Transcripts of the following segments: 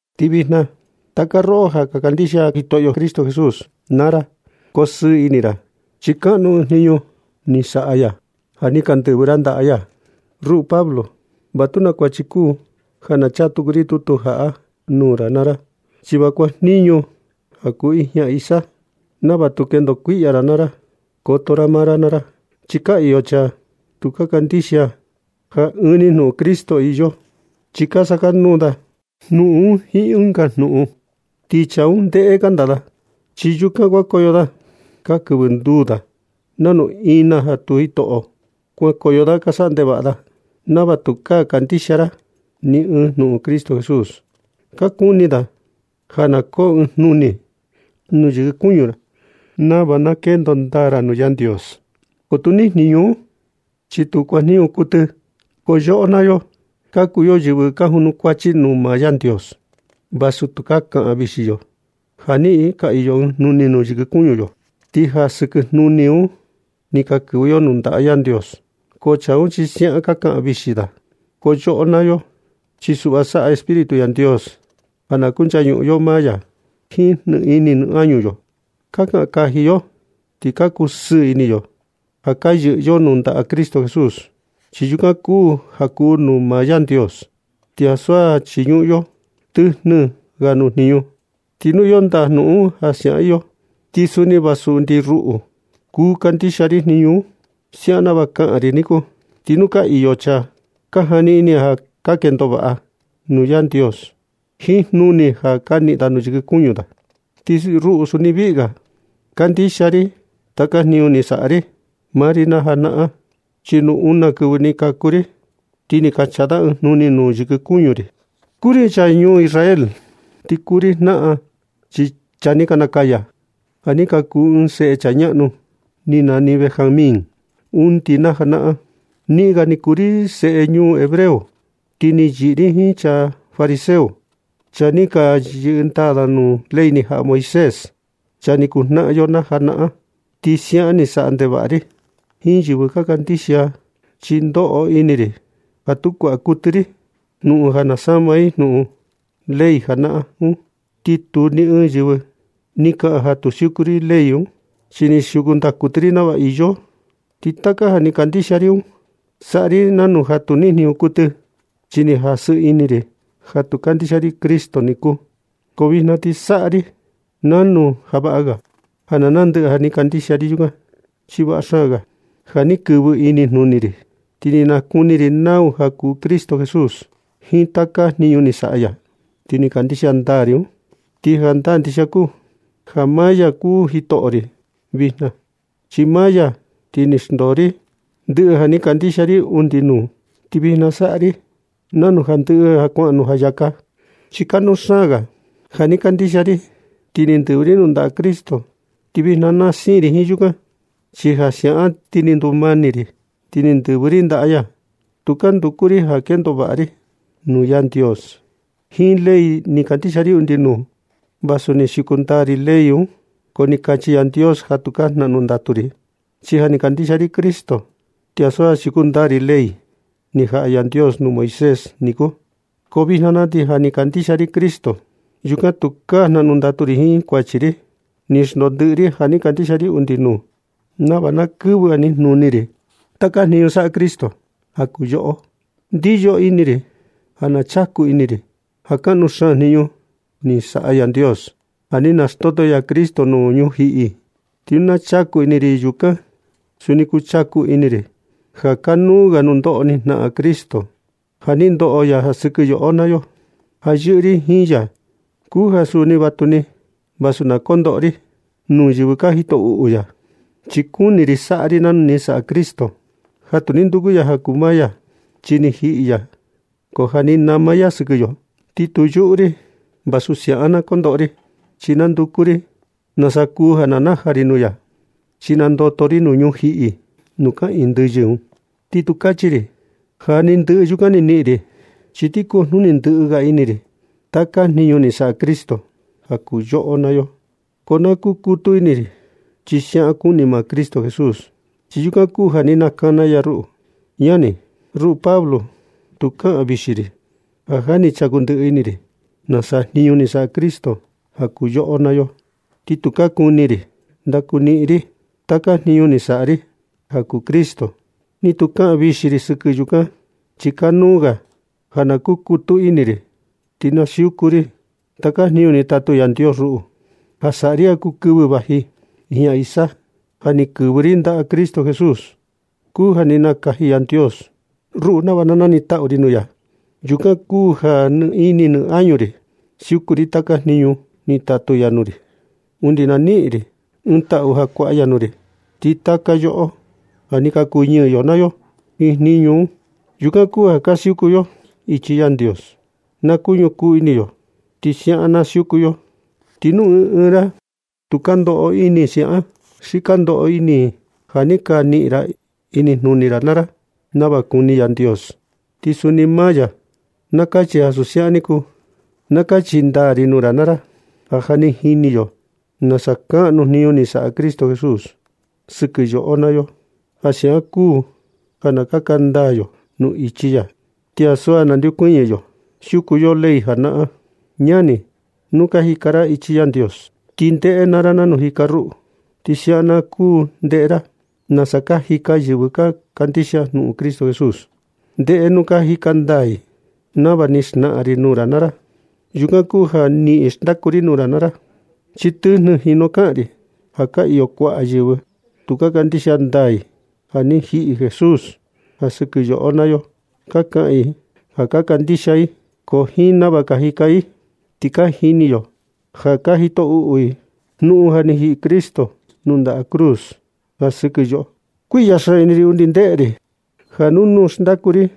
Ti vijna, taka roꞌo ja ka kandixia Jitoꞌo Cristo Jesús naa ra, kosɨɨ ini naa ra chi kaꞌnu ɨɨn jniñu ni saꞌa ya ja ni ka ndɨvɨ ra ndaꞌa ya. Ruꞌu Pablo, va tu naa kuachi kuu ja na chaa tuku ri tutu jaꞌa nuu ra naa ra, chi va kuajniñu ja kuu ijña isa nava tu kendo kuiꞌya ra naa ra. Koto ra maa ra naa ra chi ka iyo chaa tu ka kandixia ja ɨɨn ni jnuꞌun Cristo iyo, chi ka sakanuu da jnuꞌun un jiin ɨnga jnuꞌun. Ti chaa un ndéꞌé kanda da, chi yaa yukan kuankoyo da ka kɨvɨ nduu da nanu ina tu jitoꞌo. Kuankoyo da ka saꞌa ndevaꞌa da nava tukaa kandixia ra ni ɨɨn jnuꞌun Cristo Jesús. Ka kuni da ja na koo ɨɨn jnuni nuu yɨkɨ kuñu ra nava na kendo ndaa ra nuu Yandios, ko tu nijniñ un, chi tu kuajniñu kuɨtɨ. Ko yoꞌo naa yo, ka kuu yo yɨvɨ ka junukuachi nuu maa Yandios, vasu tukaa kaꞌan vixi yo ja ni ka iyo ɨɨn jnuni yɨkɨ kuñu yo, ti ja sɨkɨ jnuni un ni ka kɨvɨ yo nuu ndaꞌa Yandios. Ko chaa un chi siaꞌan ka kaꞌan vixi da. Ko yoꞌo naa yo chi suꞌva saꞌa Espíritu Yandios ja na kunchañuꞌun yo maa ya jiin nɨ ini nɨ añu yo. Ka kaꞌan kaji yo ti ka kusɨɨ ini yo ja ka yɨꞌɨ yo nuu ndaꞌa Cristo Jesús, chi yukan kuu ja kuu nuu maa Yandios, ti ansu ja chiñuꞌun yo tɨjnɨ ga nuu jniñu. Ti nu iyo ndaa jnuꞌun un ja siaꞌan iyo, ti va suni undi ruꞌu kuu kandixia ri jniñu un, siaꞌan nava kaꞌan ri niku. Ti nu ka iyo chaa ka jani ini ja ka kendo vaꞌa da nuu Yandios jiin jnuni ja ka niꞌin da nuu yɨkɨ kuñu da, ti ruꞌu suni viꞌi ga kandixia ri taka jniñu ni saꞌa maa ri naa janaꞌan. Chi nu una kɨvɨ ni kaku ri, ti ni ka chaa da ɨɨn jnuni nuu yɨkɨ kuñu ri. Kuu ri chaa ñuu Israel, ti kuu ri jnaꞌan chaa ni ka nakaya ja ni ka kuu seꞌe ɨɨn chaa ñaꞌnu ni nani Benjamín undi na najanaꞌan. Niꞌin ga ni kuu ri seꞌe ñuu hebreo, ti ni yɨꞌɨ ri jiin chaa fariseo, chaa ni ka siuku ndaa ley ni jaꞌa Yandios nuu Moisés, chaa ni kuu jnaꞌan yo najanaꞌan. Ti siaꞌan ni saꞌa ndevaꞌa ri jiin yɨvɨ ka kandixia, chi ni ndoꞌo ini ri ja tu kuaꞌa kuɨtɨ ri jnuꞌun ja sama i jnuꞌun ley janaꞌan un. Ti tu ni ɨɨn yɨvɨ ni kaꞌan ja tu ni siuku ri ley un, chi ni siuku ndaa kuɨtɨ ri nava iyo. Ti taka ja ni kandixia ri un, saꞌa ri nanu ja tu ni niꞌin jniñu kuɨtɨ, chi ni jasɨ ini ri ja tu kandixia ri Cristo niku. Ko vijna ti saꞌa ri nanu ja vaꞌa ga ja na naa ndɨꞌɨ ja ni kandixia ri yukan. Chi vaꞌa xaan ga ja ni kɨvɨ inijnuni ri, ti ni nakuni ri nau kuu Cristo Jesús jiin taka jniñu ni saꞌa ya, ti ni kandixia ndaa ri un. Ti jandaa ndixia kuu ja maa ya kuu Jitoꞌo ri vijna. Chi ja maa ya ti ni xndoo ri ndɨꞌɨ ja ni kandixia ri undi nuu, ti vijna saꞌa ri nanu ja ni ndɨꞌɨ kuaꞌan nuu jayaka. Chi kanuu xaan ga ja ni kandixia ri ti ni ndɨvɨ ri nuu ndaꞌa Cristo, ti vijna na siin ri jiin yukan. Chi ja siaꞌan na ti ni ndumani ri, ti ni ndɨvɨ ri ndaꞌa ya. Tukaa nduku ri ja kendo vaꞌa ri nuu Yandios jiin ley ni kandixia ri undi nuu, vasu ni siuku ndaa ri ley un. Ko ni kachi Yandios ja tukaa jnaꞌnu ndatu ri, chi ja ni kandixia ri Cristo, ti ansu ja siuku ndaa ri ley ni jaꞌa Yandios nuu Moisés niku. Ko vijna na ti ja ni kandixia ri Cristo, yukan tukaa ga jnaꞌnu ndatu ri jiin kuachi ri. Ni xndoo ndɨꞌɨ ri ja ni kandixia ri undi nuu nava na kɨvɨ inijnuni ri taka jniñu ñaꞌnu saꞌa Cristo ja kuu yoꞌo. Ndiyo ini ri ja na chaku ini ri ja kaꞌnu xaan ɨɨn jniñu ni saꞌa Yandios ja ni naxndoto ya Cristo nuu ñujiꞌi. Ti nu na chaku ini ri yukan, suni kuu chaku ini ri ja kaꞌnu ga nundoꞌo ni jnaꞌan Cristo ja ni ndoꞌo ya ja sɨkɨ yoꞌo naa yo. Ti ja yɨꞌɨ ri jiin ya kuu ja suni vatuni vasu na kondoꞌo ri nuu yɨvɨ ka jito uꞌu ya. Chi kuni ri saꞌa ri nanu ni saꞌa Cristo, ja tu ni nduku ya ja kuu maa ya, chi ni jiꞌi ya, ko ja ni nama ya sɨkɨ yo niku. Ti tu yuꞌu ri vasu siaꞌan na kondoꞌo ri, chi nanduku ri na nasa kuu ja najaa ri nuu ya, chi nandoto ri nuu ñujiꞌi nuu kaꞌiin ndɨyɨ un. Ti tu kachi ri ja ja ni ndɨꞌɨ yukan ni niꞌin ri, chi ti kujnuni ndɨꞌɨ ga ini ri taka jniñu ni saꞌa Cristo ja kuu yoꞌo naa yo. Ko na kukutu ini ri chi siaꞌan kuni maa Cristo Jesús, chi ja yukan kuu ja ni nakana ya ruꞌu. Ñani, ruꞌu Pablo, tu kaꞌan vixi ri ja ja ni chaku ndɨꞌɨ ini ri nasa jniñu ni saꞌa Cristo ja kuu yoꞌo naa yo. Ti tukaa kuni ri ndakuniꞌin ri taka jniñu ni saꞌa ri ja kuu Cristo, ni tu kaꞌan vixi ri sɨkɨ yukan. Chi kanuu ga ja na kukutu ini ri, ti na siuku ri taka jniñu ni tatu Yandios ruꞌu ja saꞌa ri ja kuu kɨvɨ vaji ijña isa. Ja ni kɨvɨ ri ndaꞌa Cristo Jesús kuu ja ni nakaji Yandios ruꞌu nava nanitaꞌu ri nuu ya. Yukan kuu ja nɨ ini nɨ añu ri siuku ri taka jniñu ni tatu ya nuu ri undi na niꞌin ri ɨɨn taꞌu ja kuaꞌa ya nuu ri. Ti taka yoꞌo ja ja ni ka kuñɨɨ yo naa yo jiin jniñu un. Yukan kuu ja ka siuku yo ichi Yandios. Na kuñukuu ini yo ti siaꞌan na siuku yo. Ti nu ɨɨn ɨɨn ra tu ka ndoꞌo ini siaꞌan ni, xi ka ndoꞌo ini ja ja ni ka niꞌin ra inijnuni ra naa ra nava kuni Yandios, ti suni maa ya na kachi ja ansu siaꞌan ni kuu. Na kachi ndaa ri nuu ra naa ra ja ja ni ka jini yo nasa kaꞌnu kuu jniñu ni saꞌa Cristo Jesús sɨkɨ yoꞌo naa yo. Ja siaꞌan kuu ja na kaka ndaa yo nuu ichi ya ti ansu ja nandeokuñɨ yo siuku yo ley najanaꞌan un. Ñani, nu ka jika ra ichi Yandios ti ndeꞌe naa ra nanu jika ruꞌu. Ti nava siaꞌan na kuu ndeꞌe ra nasa ka jika yɨvɨ ka kandixia jnuꞌun Cristo Jesús, ndeꞌe nu ka jika ndaa i nava ni xnaꞌan ri nuu ra naa ra. Yukan kuu ja niꞌin xndaku ri nuu ra naa ra, chi tɨjnɨ jinu kaꞌan ri ja ka iyo kuaꞌa yɨvɨ tu ka kandixia ndaa i ja ni jiꞌi Jesús ja sɨkɨ yoꞌo naa yo. Ka kaꞌan i ja ka kandixia i, ko jiin nava jika i ti ka jini yo ja ka jito uꞌu i jnuꞌun ja ni jiꞌi Cristo nuu ndaꞌa cruz ja sɨkɨ yo. Kuiꞌya xaan ini ri undi ndeꞌe ri, ja nuu nuu xndaku ri,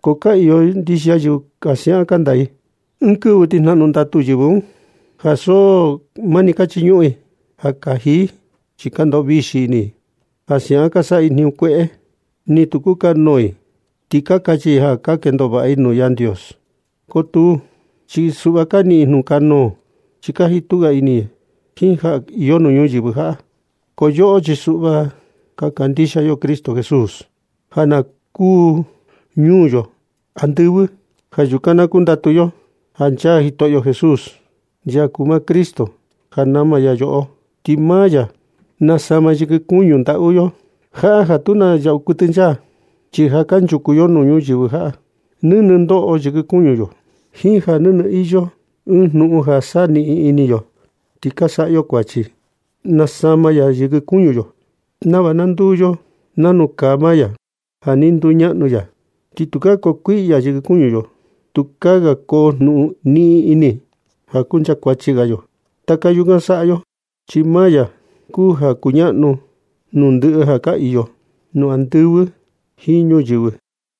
ko ka iyo ndixia yɨvɨ ja siaꞌan kanda i. Ɨɨn kɨvɨ ti jnaꞌnu ndatu yɨvɨ un, ja so mani ka chiñuꞌun i ja kaji i. Chi ka ndoꞌo vixi ini i ja siaꞌan ka saꞌa i jniñu kueꞌe, ni tu kukanuu i, ti kachi ja ka kendo vaꞌa i nuu Yandios. Ko tuu, chi suꞌva ka niꞌin i jnukanuu, chi ka jitu ga ini i jiin ja iyo nuu ñuyɨvɨ jaꞌa. Ko yoꞌo chi suꞌva ka kandixia yo Cristo Jesús, ja na kuu ñuu yo andɨvɨ. Ja yukan na kundatu yo ja nchaa Jitoꞌo Jesús, ya kuu maa Cristo ja nama ya yoꞌo. Ti maa ya nasama yɨkɨ kuñu ndaꞌu yo jaꞌa ja tu na yaꞌu nchaa. Chi ja kanchuku yo ñuyɨvɨ jaꞌa, nɨnɨ ndoꞌo yɨkɨ kuñu yo jiin ja nɨnɨ iyo ɨɨn jnuꞌun ja saniꞌin ini yo, ti ka saꞌa yo kuachi. Nasama ya yɨkɨ kuñu yo nava na nduu yo nanu kaa maa ya ja ni nduñaꞌnu ya. Ti tukaa koo kuiꞌya yɨkɨ kuñu yo. Tukaa ga koo jnuꞌun niꞌin ini ja kuncha kuachi ga yo. Taka yukan saꞌa yo chi maa ya kuu ja kuñaꞌnu nuu ndɨꞌɨ ja ka iyo nuu andɨvɨ jiin nuu ñuyɨvɨ.